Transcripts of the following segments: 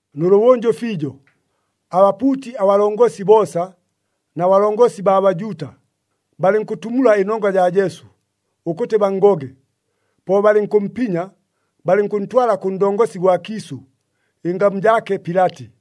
Nʉlʉbʉnjʉ fiijo, abapuuti abalongosi boosa na balongosi baa Bajuuta, balɨnkʉtumula ɨnongwa jaa Jesu, ʉkʉtɨ banngoge. Po balɨnkʉmpinya, balɨnkʉntwala kʉ ndongosi gwa kiisʉ, ɨngamu jaake Pilati.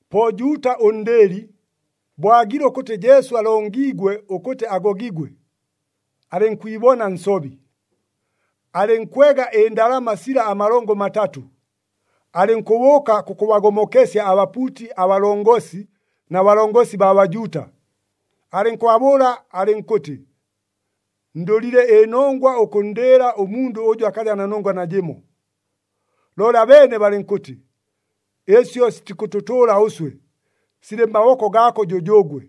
Po Juuta ʉndɨɨli, bo aagile ʉkʉtɨ Jesu alongiigwe ʉkʉtɨ agogigwe, alɨnkwibona nsobi. Alɨnkwega ɨndalama sila amalongo matatʉ, alɨnkʉbʉʉka kʉkʉbagomokesya abapuuti abalongosi na balongosi baa Bajuuta. Alɨnkʉbabʉʉla alɨnkʉtɨ, “Ndʉlile ɨnongwa ʉkʉnndɨɨla ʉmundʉ ʉjʉ akaja na nongwa najɨmo.” Looli abeene balɨnkʉtɨ, “Ɨsyo sitikʉtʉtʉʉla ʉswe, silɨ mmaboko gaako jʉjʉʉgwe.”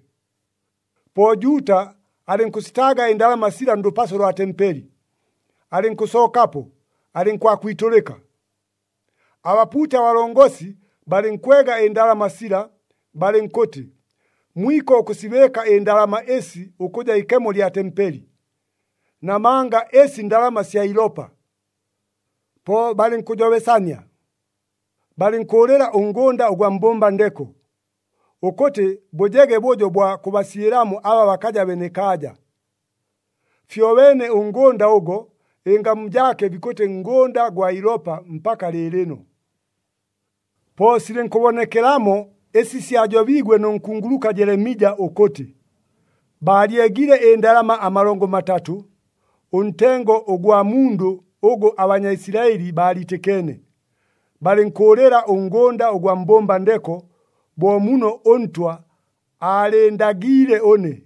Po Juuta alɨnkʉsitaaga ɨndalama sila ndʉpaso lwa tempeli, alɨnkʉsookapo, alɨnkwakwitʉlɨka. Abapuuti abalongosi balɨnkwega ɨndalama sila, balɨnkʉtɨ, “Mwiko ʉkʉsibɨɨka ɨndalama ɨsi ʉkʉja ikemo lya tempeli, namanga ɨsi ndalama sya ilopa.” Po balɨnkʉjobesania, balɨnkʉʉlɨla ʉngʉnda ʉgwa mbʉmba ndeko, ʉkʉtɨ bʉjege bʉjo bwa kʉbasyɨlamo aba bakaja benekaaja. Fyobeene ʉngʉnda ʉgo, ɨngamu jaake bikʉtɨ Ngʉnda gwa Ilopa mpaka lɨɨlɨno. Po silɨnkʉbonekelamo ɨsi syajobiigwe nʉ nkunguluka Jelemija ʉkʉtɨ, “Baalyegile ɨndalama amalongo matatʉ, ʉntengo ʉgwa mundʉ ʉgʉ aBanyaisilaɨli baaliitɨkeene. Balɨnkʉʉlɨla ʉngʉnda ʉgwa mbʉmba ndeko bo muno ʉNtwa aalɨɨndagiile ʉne.”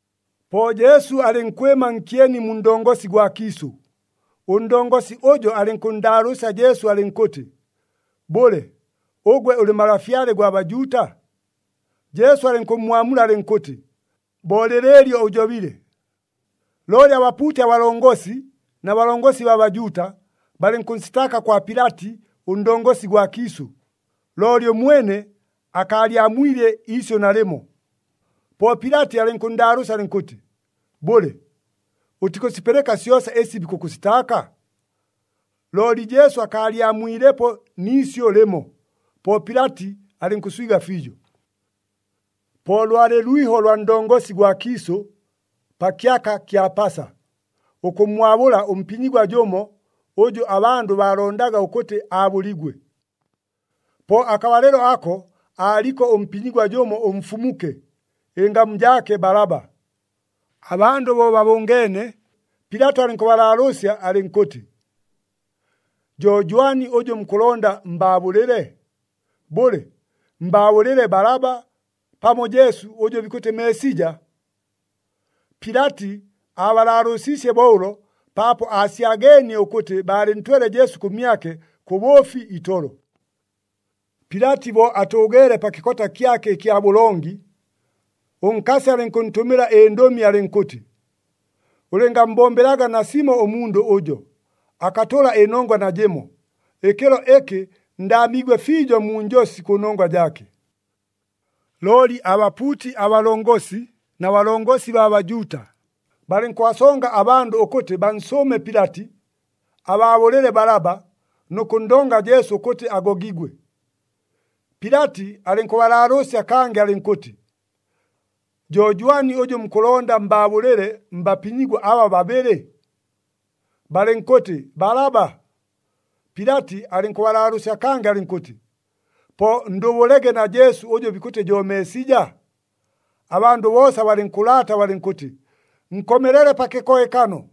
Po Jesu alɨnkwɨma nkyeni mu ndongosi gwa kiisʉ, ʉndongosi ʉjo alɨnkʉnndaalʉʉsya Jesu alɨnkʉtɨ, “Bʉle, ʉgwe ʉlɨ Malafyale gwa Bajuuta?” Jesu alɨnkʉmmwamula alɨnkʉtɨ, “Bo lɨlɨɨlyo ʉjobile.” Looli abapuuti abalongosi na balongosi baa Bajuuta, balɨnkʉnsitaaka kwa Pilati ʉndongosi gwa kiisʉ, looli ʉmwene akaalyamwile iisyʉ nalɨmo. Po Pilati alɨnkʉnndaalʉʉsya alɨnkʉtɨ, “Bʉle, ʉtikʉsipɨlɨka syosa ɨsi bikʉkʉsitaaka?” Looli Jesu akaalyamwilepo ni isyʉ lɨmo. Po Pilati alɨnkʉswiga fiijo. Po lwalɨ lwiho lwa ndongosi gwa kiisʉ, pa kyaka kya Pasa, ʉkʉmmwabʉla ʉmpinyigwa jʉmo, ʉjʉ abandʉ baalondaga ʉkʉtɨ aabʉligwe. Po akabalɨlo ako, aaliko ʉmpinyigwa jʉmo ʉmfumuke, ɨngamu jaake Balaba. Abandʉ bo babʉngeene, Pilati alɨnkʉbalaalʉʉsya alɨnkʉtɨ, “Jo jwani ʉjʉ mukʉlonda mbaabʉlɨle? Bʉle, mbaabʉlɨle Balaba, pamo Jesu, ʉjʉ bikʉtɨ Meesija?” Pilati aabalaalʉʉsiisye bo ʉlo paapo aasyageenie ʉkʉtɨ baalɨntwele Jesu kʉmyake kʉ bʉʉfi itolo. Pilati bo atʉʉgeele pa kɨkota kyake ɨkya bʉlongi, ʉnkasi alɨnkʉntʉmɨla ɨndʉmi alɨnkʉtɨ, “Ʉlɨngammbombelaga nasimo ʉmundʉ ʉjo, akatʉla ɨnongwa najɨmo. Ɨkɨlo ɨkɨ ndaamiigwe fiijo mu njosi kʉnongwa jaake.” Looli abapuuti abalongosi na balongosi baa Bajuuta, balɨnkʉbasonga abandʉ ʉkʉtɨ bansʉʉme Pilati, abaabʉlɨle Balaba nʉ kʉnndonga Jesu ʉkʉtɨ agogigwe. Pilati alɨnkʉbalaalʉʉsya kangɨ alɨnkʉtɨ, “Jo jwani ʉjʉ mukʉlonda mbaabʉlɨle mbapinyigwa aba babɨlɨ?” Balɨnkʉtɨ, “Balaba.” Pilati alɨnkʉbalaalʉʉsya kangɨ alɨnkʉtɨ, “Po ndʉbʉlege na Jesu ʉjʉ bikʉtɨ jo Meesija?” Abandʉ boosa balɨnkʉlaata balɨnkʉtɨ, “Nkomelele pa kɨkohekano!”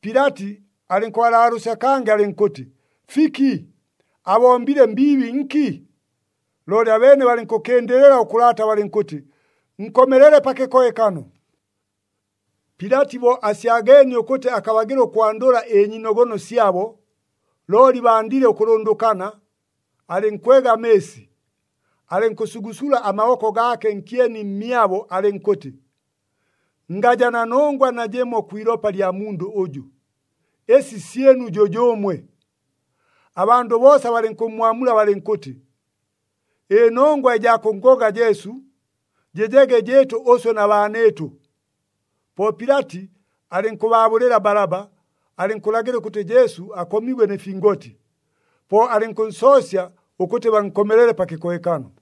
Pilati alɨnkʉbalaalʉʉsya kangɨ alɨnkʉtɨ, “Fiki? Abombile mbiibi nki?” Looli abeene balɨnkʉkɨndɨlɨla ʉkʉlaata balɨnkʉtɨ, “Nkomelele pa kɨkohekano!” Pilati bo asyageenie ʉkʉtɨ akabagɨla ʉkwandʉla ɨnyiinogono syabo, looli bandile ʉkʉlʉndʉkana, alɨnkwega amɨɨsi, alɨnkʉsugusula amaboko gaake nkyeni mmyabo, alɨnkʉtɨ, “Ngaja na nongwa najɨmo kwi ilopa lya mundʉ ʉjʉ. Ɨsi syɨnu jʉjʉʉmwe!” Abandʉ boosa balɨnkʉmmwamula balɨnkʉtɨ, “Ɨnongwa ɨjaa kʉnngoga Jesu jɨjege jɨɨtʉ ʉswe na baanɨɨtʉ!” Po Pilati alɨnkʉbaabʉlɨla Balaba, alɨnkʉlagɨla ʉkʉtɨ Jesu akomigwe nɨ fingoti, po alɨnkʉnsoosya ʉkʉtɨ bankomelele pa kɨkohekano.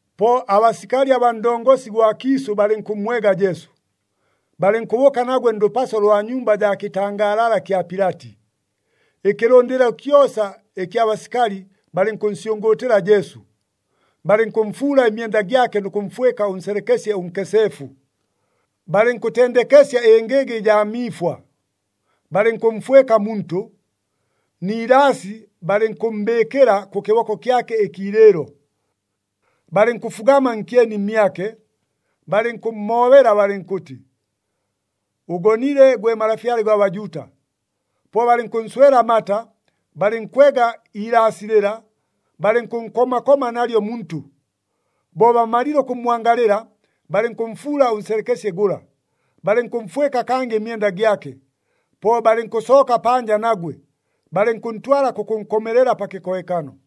Po abasikali abaa ndongosi gwa kiisʉ balɨnkʉmmwega Jesu, balɨnkʉbʉʉka nagwe ndʉpaso lwa nyumba jaa kɨtangaalala kya Pilati. Ɨkɨlʉndɨlo kyosa ɨkya basikali balɨnkʉnsyʉngʉʉtɨla Jesu. Balɨnkʉmfuula ɨmyenda gyake nʉ kʉmfwɨka ʉnselekesye ʉnkeseefu. Balɨnkʉtendekesya ɨngɨga ɨjaa miifwa, balɨnkʉmfwɨka muntʉ, ni ilaasi balɨnkʉmmbɨɨkɨla kʉ kɨboko kyake ɨkiilɨɨlo. Balɨnkʉfugama nkyeni mmyake, balɨnkʉmmoobela balɨnkʉtɨ, “Ʉgonile, gwe Malafyale gwa Bajuuta!” Po balɨnkʉnswela amata, balɨnkwega iilaasi lɨla, balɨnkʉnkoma koma nalyo muntʉ. Bo bamalile ʉkʉmmwangalɨla, balɨnkʉmfuula ʉnselekesye gʉla, balɨnkʉmfwɨka kangɨ ɨmyenda gyake. Po balɨnkʉsooka panja nagwe, balɨnkʉntwala kʉkʉnkomelela pa kɨkohekano.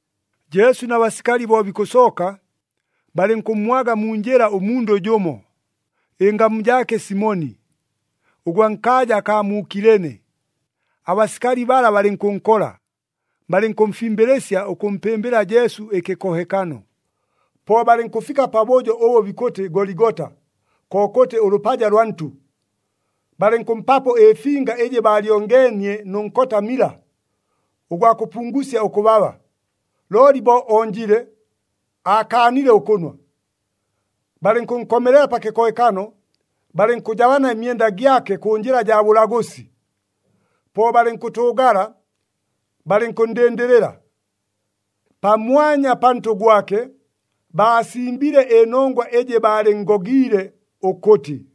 Jesu na basikali bo bikʉsooka, balɨnkʉmmwaga mu njɨla ʉmundʉ jʉmo, ɨngamu jaake Simoni, ʉgwa nkaaja akaa mu Kilene. Abasikali bala balɨnkʉnkola, balɨnkʉmfimbɨlɨsya ʉkʉmpɨmbɨla Jesu ɨkɨkohekano. Po balɨnkʉfika pabʉjo ʉbʉ bikʉtɨ Goligota, kokʉtɨ ʉLʉpaja lwa Ntʉ. Balɨnkʉmpapo ɨfinga ɨjɨ baalyongeenie nʉ nkota mila, ʉgwa kʉpungusya ʉkʉbaba, looli bo onjile, aakaanile ʉkʉnwa. Balɨnkʉnkomelela pa kɨkohekano, balɨnkʉjabana ɨmyenda gyake kʉ njɨla jaa bʉlagʉsi. Po balɨnkʉtʉʉgala, balɨnkʉnndɨndɨlɨla. Pamwanya pantʉ gwake, baasimbile ɨnongwa ɨjɨ baalɨnngogiile ʉkʉtɨ,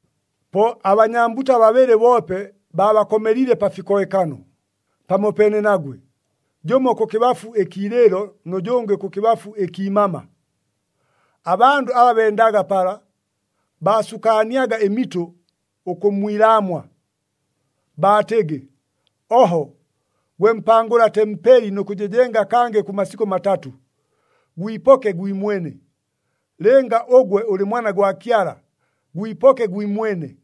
Po abanyambuta babɨlɨ boope baabakomeliile pa fikohekano, pamopeene nagwe, jʉmo kʉkɨbafu ɨkiilɨɨlo nʉ jʉngɨ kʉkɨbafu ɨkiimama. Abandʉ aba bendaga pala, baasukaaniaga ɨmitʉ ʉkʉmmwilaamwa. Baatɨgɨ, “Oho! Gwe mpangʉla tempeli nʉ kʉjɨjenga kangɨ kʉ masikʉ matatʉ, gwipoke gwimwene! Lɨnga ʉgwe ʉlɨ Mwana gwa Kyala, gwipoke gwimwene!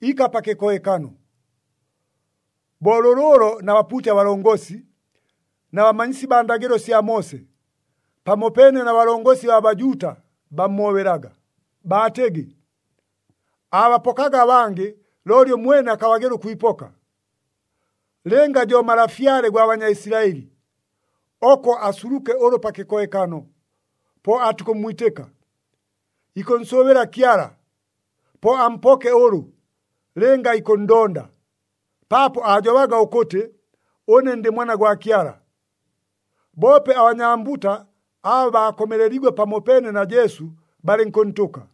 Ika pa kɨkohekano!” Bo lʉlʉʉlo na bapuuti abalongosi, na bamanyisi baa ndagɨlo sya Moose, pamopeene na balongosi baa Bajuuta bammoobelaga, baatɨgɨ, “Aabapokaga abangɨ, looli ʉmwene akabagɨla ʉkwipoka! Lɨnga jo Malafyale gwa Banyaisilaɨli, oko asuluke ʉlʉ pa kɨkohekano, po aatukʉmmwitɨka. Ikʉnsʉʉbɨla Kyala, po ampoke ʉlʉ, lɨnga ikʉnndonda, paapo aajobaga ʉkʉtɨ, ‘Ʉne ndɨ Mwana gwa Kyala.’” Boope abanyambuta aba baakomeleliigwe pamopeene na Jesu, balɨnkʉntʉka.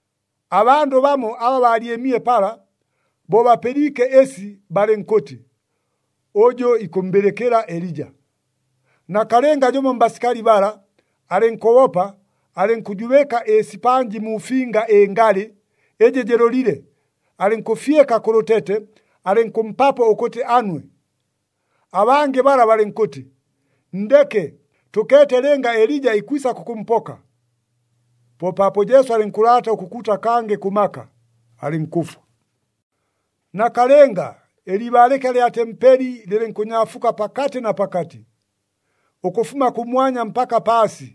Abandʉ bamo aba baalyɨmile pala, bo bapɨliike ɨsi balɨnkʉtɨ, “Ʉjʉ ikʉmmbɨlɨkɨla Elija.” Nakalɨnga jʉmo mbasikali bala, alɨnkʉbopa, alɨnkʉjubɨka ɨsipanji mu finga ɨngalɨ, ɨjɨ jɨlʉlile, alɨnkʉfyɨka kʉ lʉtete, alɨnkʉmpapo ʉkʉtɨ anwe. Abangɨ bala balɨnkʉtɨ, “Nndeke! Tʉkeete lɨnga Elija ikwisa kʉkʉmpoka.” Po paapo Jesu alɨnkʉlaata ʉkʉkuuta kangɨ kʉ maka, alɨnkʉfwa. Nakalɨnga, ɨliibaalɨka lya tempeli lɨlɨnkʉnyaafuka pakatɨ na pakatɨ, ʉkʉfuma kʉmwanya mpaka paasi.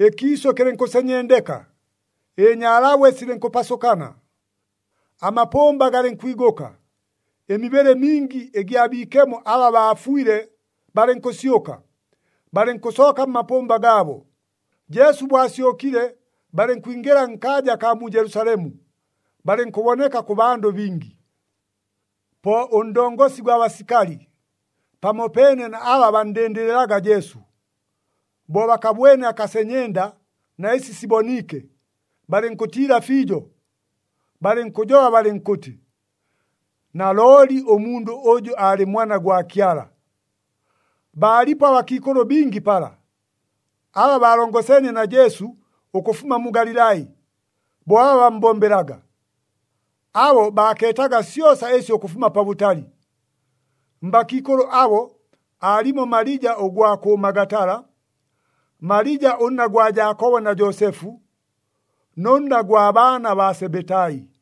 Ɨkiisʉ kɨlɨnkʉsenyendeka, ɨnyaalabwe silɨnkʉpasʉkana. Amapʉmba galɨnkwigʉka, ɨmibɨlɨ mingi ɨgya biikemo aba baafwile, balɨnkʉsyʉka, balɨnkʉsooka mmapʉmba gaabo. Jesu bo asyʉkile, balɨnkwingɨla nkaaja akaa mu Jelusalemu, balɨnkʉboneka kʉ bandʉ bingi. Po ʉndongosi gwa basikali, pamopeene na aba banndɨndɨlɨlaga Jesu, bo bakabwene akasenyenda na ɨsi siboniike, balɨnkʉtiila fiijo, balɨnkʉjoba balɨnkʉtɨ, “Nalooli ʉmundʉ ʉjʉ aalɨ Mwana gwa Kyala!” Baalipo abakiikʉlʉ bingi pala, aba baalongoseenie na Jesu ʉkʉfuma mu Galilai, bo aba bammbombelaga. Abo baakeetaga syosa ɨsyo ʉkʉfuma pabʉtali. Mbakiikʉlʉ abo, aalimo Malija ʉgwa kʉ Magatala, Malija ʉnna gwa Jaakobo na Joosefu, nʉ nna gwa baana baa Sebetai.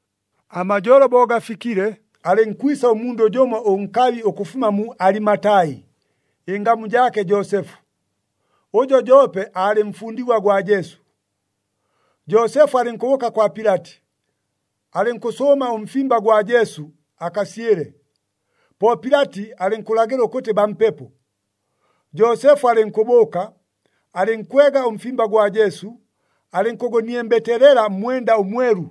Amajolo bo gafikile, alɨnkwisa ʉmundʉ jʉmo ʉnkabi ʉkʉfuma mu Alimatai, ɨngamu jaake Joosefu. Ʉjo joope aalɨ mfundigwa gwa Jesu. Joosefu alɨnkʉbʉʉka kwa Pilati, alɨnkʉsʉʉma ʉmfimba gwa Jesu, akasyɨle. Po Pilati alɨnkʉlagɨla ʉkʉtɨ bampepo. Joosefu alɨnkʉbʉʉka, alɨnkwega ʉmfimba gwa Jesu, alɨnkʉgʉniembeteelela mmwenda ʉmwelu.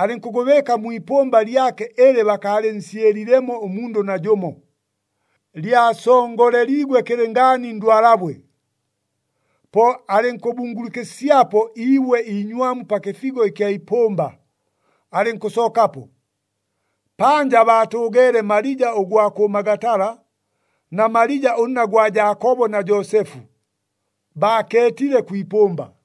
Alɨnkʉgʉbɨɨka mwi ipʉmba lyake ɨlɨ bakaalɨnsyɨlilemo ʉmundʉ najʉmo, lyasongoleliigwe kɨlɨngaani ndwalabwe. Po alɨnkʉbungulukɨsyapo iibwe iinywamu pa kɨfigo ɨkya ipʉmba, alɨnkʉsookapo. Panja baatʉʉgeele Malija ʉgwa kʉ Magatala na Malija ʉnna gwa Jaakobo na Joosefu, baakeetile kwi ipʉmba.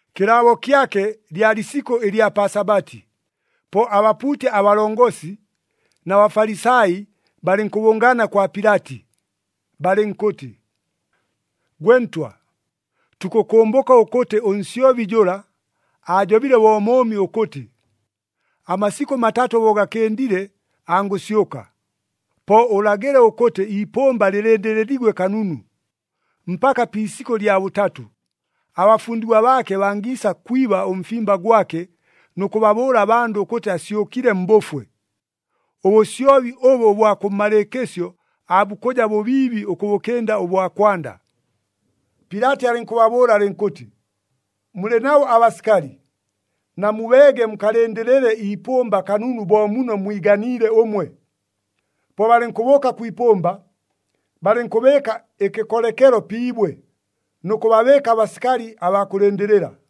Kɨlaabo kyake lyalɨ isikʉ ɨlya pa Sabati. Po abapuuti abalongosi na Bafalisai balɨnkʉbʉngaana kwa Pilati. Balɨnkʉtɨ, “Gwe ntwa, tukʉkʉmbʉka ʉkʉtɨ ʉnsyobi jʉla, aajobile bo mʉʉmi ʉkʉtɨ, ‘Amasikʉ matatʉ bo gakɨndile angʉsyʉka.’ Po ʉlagɨle ʉkʉtɨ iipʉmba lɨlɨndɨlɨliigwe kanunu, mpaka pi isikʉ lya bʉtatʉ, abafundigwa baake bangiisa kwiba ʉmfimba gwake nʉ kʉbabʉʉla abandʉ ʉkʉtɨ asyʉkile mbʉfwe. Ʉbʉsyobi ʉbʉ ʉbwa kʉmmalɨɨkɨsyo aabukʉja bʉbiibi ʉkʉbʉkɨnda ʉbwa kwanda.” Pilati alɨnkʉbabʉʉla alɨnkʉtɨ, “Mulɨ nabo abasikali, namubeege mukalɨndɨlɨle iipʉmba kanunu bo muno mwiganiile ʉmwe.” Po balɨnkʉbʉʉka kwi ipʉmba, balɨnkʉbɨɨka ɨkɨkolekelo pi ibwe, nʉ kʉbabɨɨka abasikali abaa kʉlɨndɨlɨla.